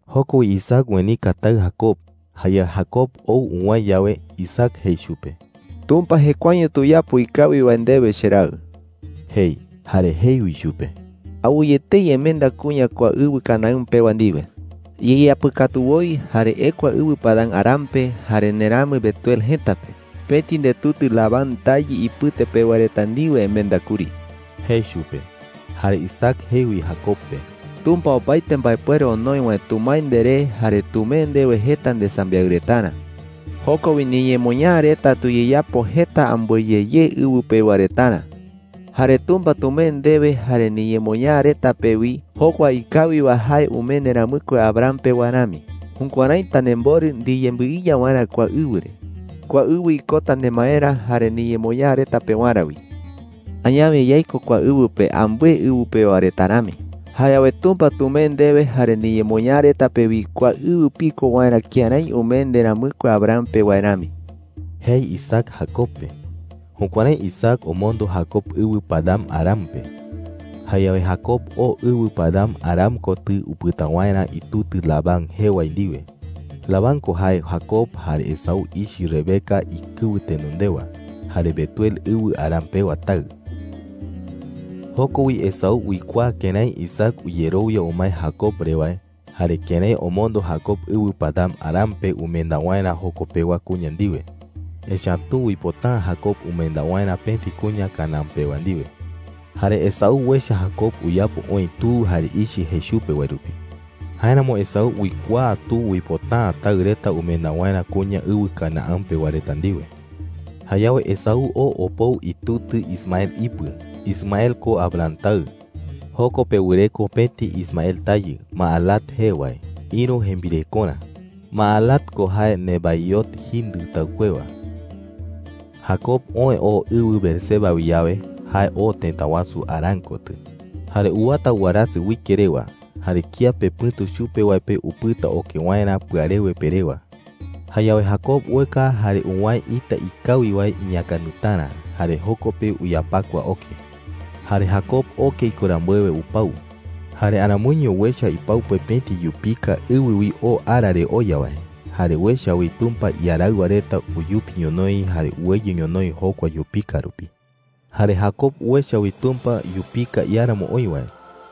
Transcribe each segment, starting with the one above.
Joko wi Isaac uenika taɨ Jacob. Jayawe Jacob ou uwäe yawe, Isaac jei chupe: “Tumpa jekuaeño tuyapo ikawi wae ndewe, cheraɨ,” jei. Jare jei wi chupe: “Awɨye etei emenda kuña kua ɨwɨ Canaán pewa ndiwe,” jei. “Iyeyapɨkatu woi, jare ekua ɨwɨ Padan-aram pe jare nderamɨ Betuel jëta pe. Pëti ndetutɨ Labán tayɨ ipɨte pewa reta ndiwe emenda kuri,” jei chupe. Jare Isaac jei wi Jacob pe: “Tumpa opaete mbaepuere onoi wae tumae nderé jare tumee ndewe jeta ndesambiaɨ retarä,” jei. “Joko wi niñemoñaa reta tuyeyapo jeta ambɨe ye ye ɨwɨ pewa retarä. Jare Tumpa tumee ndewe jare niñemoñaa reta pe wi jokua ikawi wae jae umee nderamɨkue Abraham pe wae rami. Jukuärái tanemborɨ ndiyembɨiya waerä kua ɨwɨ re. Kua ɨwɨ ikota nemaerä jare niñemoñaa reta pewarä wi. Añawe yaiko kua ɨwɨ pe ambɨe ɨwɨ pewa reta rami. Jayawe Tumpa tumee ndewe jare niñemoñaa reta pe wi kua ɨwɨ piko waerä kërái umee nderamɨkue Abraham pe wae rami,” jei Isaac Jacob pe. Jukuärái Isaac omondo Jacob ɨwɨ Padan-aram pe. Jayawe Jacob oo ɨwɨ Padan-aram kotɨ upɨta waerä itutɨ Labán jee wae ndiwe. Labán ko jae Jacob jare Esaú ichɨ Rebeca ikɨwɨ tenondewa, jare Betuel ɨwɨ Aram pewa taɨ. Joko wi Esaú uikuaa kërái Isaac uyerowia umae Jacob re wae, jare kërái omondo Jacob ɨwɨ Padan-aram pe umenda waerä joko pewa kuña ndiwe. Echa’ä tu uipota’ä Jacob umenda waerä pëti kuña Canaán pewa ndiwe. Jare Esaú uecha Jacob uyapo oï tu jare ichɨ jei chupe wae rupi. Jáeramo Esaú uikuaa tu uipota’ä taɨ reta umenda waerä kuña ɨwɨ Canaán pewa reta ndiwe. Jayawe Esaú oo opou itutɨ Ismael ipɨ. Ismael ko Abraham taɨ. Joko pe wɨreko pëti Ismael tayɨ, Mahalat jee wae, ïru jembirekorä. Mahalat ko jae Nebaiot jindɨ taɨkuewa. Jacob oë oo ɨwɨ Beerseba wi yawe, jae oo tëta wasu Harán kotɨ. Jare uwata warasɨ uike rewa. Jare kiape pɨ̈tu chupe wae pe upɨta oke waerä pɨarewe pe rewa. Jayawe Jacob ueka jare uwäe ita ikawi wae iñäkandɨtarä, jare joko pe uyapakua oke. Jare Jacob oke iko rambuewe, upau. Jare aramoiño uecha ipau pe pëti yupika ɨwɨ wi oo ara re oya wae. Jare uecha wi Tumpa iaraɨwa reta uyupi ñonoï jare uweyɨ ñonoï jokua yupika rupi. Jare Jacob uecha wi Tumpa yupika iáramo oï wae.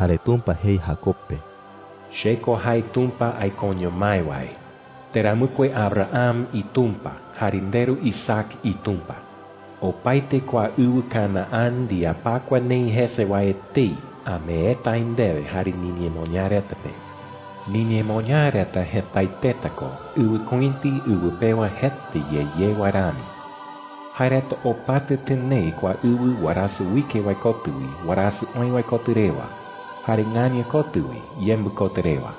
Jare Tumpa jei Jacob pe: “Che ko jae Tumpa aikoño mái wae, nderamɨkue Abraham iTumpa jare nderu Isaac iTumpa,” jei. “Opaete kua ɨwɨ Canaán, ndiyapakua neï jese wae etei, ameeta aï ndewe jare niñemoñaa reta pe,” jei. “Niñemoñaa reta jetaeteta ko ɨwɨkuïti ɨwɨ pewa jeta ye ye wae rami. Jae reta opata tɨnee kua ɨwɨ warasɨ uike wae kotɨ wi warasɨ oë wae kotɨ rewa, jare ɨaña kotɨ wi yembɨ kotɨ rewa.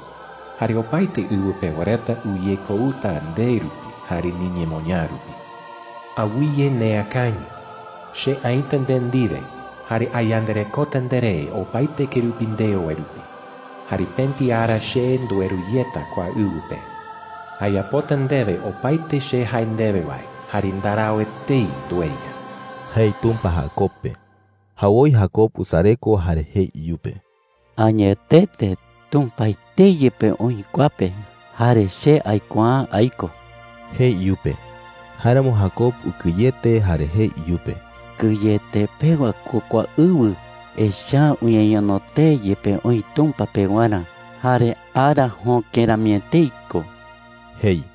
Jare opaete ɨwɨ pewa reta uyekouta nde rupi jare niñemoñaa rupi,” jei. “Awɨye neakañɨ. Che aïta nde ndiwe, jare ayandarekota nderé opaete kerupi ndeo wae rupi. Jare pëti ara che ndueru yeta kua ɨwɨ pe,” jei. “Ayapota ndewe opaete che jae ndewe wae, jare ndarau etei ndueya,” jei Tumpa Jacob pe. Jawoi Jacob usareko jare jei iyupe: “Añetete Tumpa etei yepe oï kua pe, jare che aikuaa’ä aiko,” jei iyupe. Jáeramo Jacob ukɨyete jare jei iyupe: “¡Kɨyete pewa ko kua ɨwɨ! Echa’ä uñeñono tee yepe oï Tumpa pewarä, jare ara jöke rami etei ko,” jei.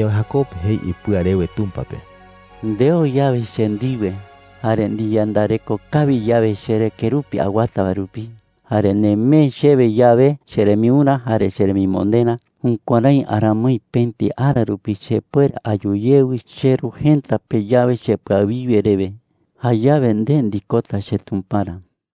Jayawe Jacob jei ipɨa rewe Tumpa pe: “Ndeo yawe che ndiwe, jare ndiyandareko kawi yawe cheré kerupi awata wae rupi, jare nemee chewe yawe cherembiurä jare cheremimonderä, jukuärái aramoi pëti ara rupi chepuere ayu yewɨ cheru jëta pe yawe chepɨawiwe rewe, jayawe nde ndikota cheTumparä,” jei.